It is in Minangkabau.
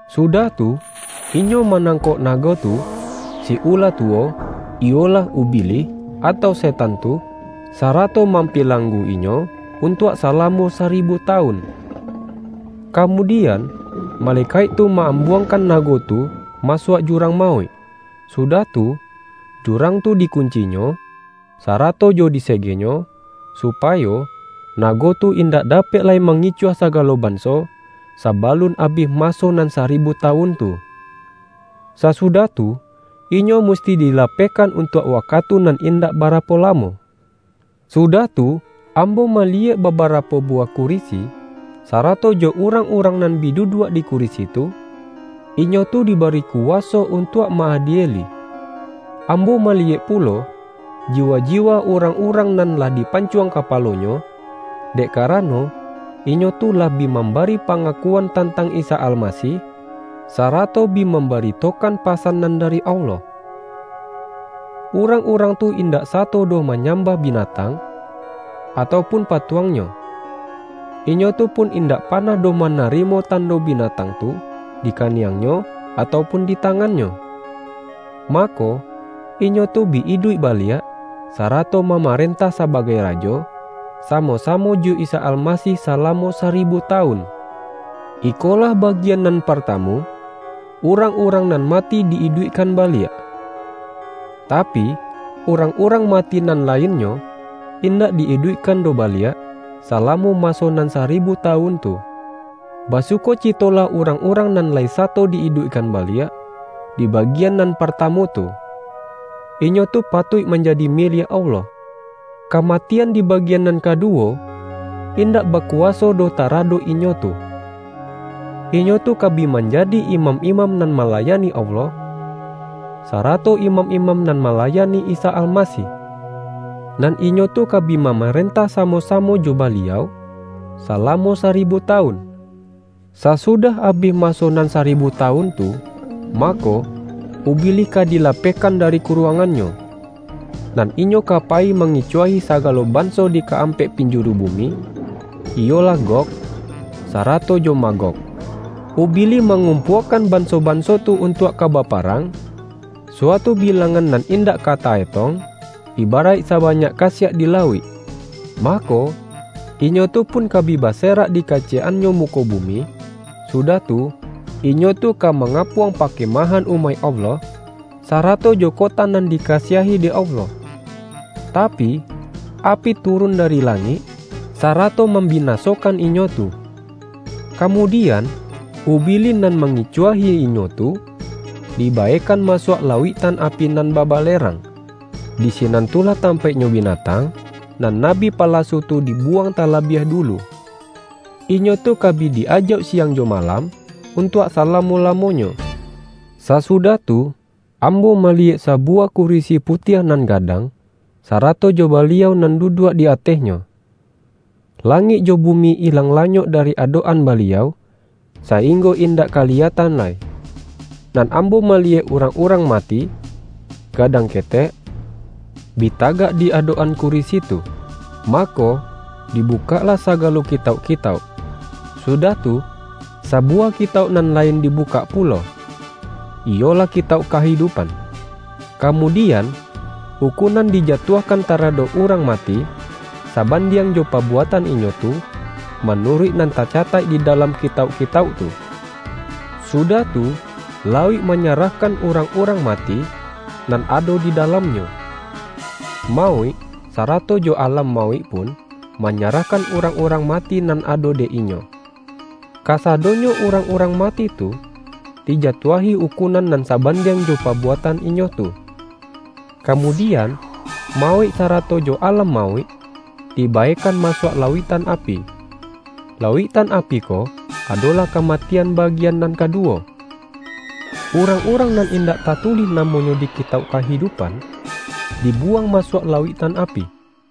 Sudah tu, inyo manangkok nago tu, si ula tuwo, iyolah Ubilih atau Setan tu sara-to mampilanggu-inyo untuak salamo saribu tawun. Kamudian, malekaik tu ma-ambuangkan nago tu masuak jurang mauik, sudah tu, jurang tu di-kuncinyo, sarato jo disegenyo, supa-yo nago tu indak dapek lai mangicuah sagalo banso, sabalun abih maso nan saribu tawun tu. Sasudah tu, inyo musti dilapehkan untuak wakatu nan indak barapo lamo. Sudah tu, ambo maliyek babarapo buwah kurisi, sarato jo urang-urang nan bi duduak di kurisi tu, inyo tu di-bari kuwaso untuak ma-adieli. Ambo maliyek pulo, jiwa-jiwa urang-urang nan lah dipancuang kapalonyo, dek karano, inyo tu lah bi mambari pa-ngakuan tantang Isa Almasih, sara-to bi mambaritokan pasan nan dari Allah. Urang-urang tu indak sato doh manyambah binatang, atau pun pa-tuangnyo. Inyo tu pun indak panah doh manarimo tando binatang tu di kaniangnyo, atau pun di tangannyo. Mako, inyo tu bi iduik baliak, sarato mamarentah sabagai rajo, samo-samo jo Isa Almasih salamo saribu tawun. Ikolah bagian nan partamu, urang-urang nan mati di-iduikkan baliak. (Tapi, urang-urang mati nan lainnyo, indak di-iduikkan doh baliak, salamo maso nan saribu tawun tu.) Basuko-citolah urang-urang nan lai sato di iduikkan baliak, di bagian nan parta-mu tu. Inyo tu patuik manjadi miliak Allah. Kamatian di bagian nan kadu-wo, indak bakuwaso doh taradok inyo tu. Inyo tu ka bi manjadi imam-imam nan malayani Allah, sarato imam-imam nan malayani Isa Almasih; nan inyo tu ka bi mamarentah samo-samo jo Baliau, salamo saribu tawun. Sasudah abih maso nan saribu tawun tu, mako, Ubilih ka dilapeh-kan dari kuruangannyo, nan inyo ka payi mangicuahi sagalo banso di ka-ampek pinjuru bumi, iyolah Gog, sarato jo Magog. Ubilih mangumpua-kan banso-banso tu untuak ka bapa-rang, suatu bilangan nan indak ka ta-etong, ibaraik sabanyak kasiak di lauik. Mako, inyo tu pun ka bi base-rak di kaciyek-annyo muko bumi, su-dah tu, inyo tu ka mangapuang pa-kemahan umaik Allah, sarato jo kota nan dikasiahi dek Allah. Tapi, api tu-run dari langik, sarato mambinasokan inyo tu. Kamudian Ubilih nan ma-ngicuahi inyo tu, dibaekan masuak la-uiktan api nan babalerang. Di sinan tu lah tampaiknyo binatang, nan na-bi palasu tu dibuwang talabiah dulu. Inyo tu ka bi di-ajauk siang jo malam, untuak salamo-lamonyo. Sasudah tu, ambo maliyek sabu-wah kurisi putiah nan gadang, sarato jo Baliau nan duduak di atehnyo. La-ngik jo bumi ilang-lanyok dari adok-an Baliau, sainggo indak kaliyatan lai. Nan ambo maliyek urang-urang mati, gadang ketek, bi tagak di adok-an kurisi tu. Mako, dibukaklah saga-lo kitauk-kitauk. Sudah tu, sabuwah kitauk nan lain dibukak pulo, iyolah Kitauk Kahidupan. Kamudian, ukunan dijatuahkan taradok urang mati, sabandiang jo pabuatan inyo tu, ma-nuruik nan tacataik di dalam kitauk-kitauk tu. Sudah tu, lauik manyarahkan urang-urang mati, nan ado di dalam-nyo. Mauik, sarato jo Alam Mauik pun, manyarahkan urang-urang mati nan ado dek inyo. Kasadonyo urang-urang mati tu, dijatuahi ukunan nan sabandiang jo pabuatan inyo tu. Kamudian, Mauik sarato jo Alam Mauik, dibaekan masuak lauiktan api. (Lauiktan api ko, adolah kama-tian bagian nan kaduwo.) Urang-urang nan indak tatulih namonyo di Kitauk Kahidupan, dibuwang masuak lauiktan api.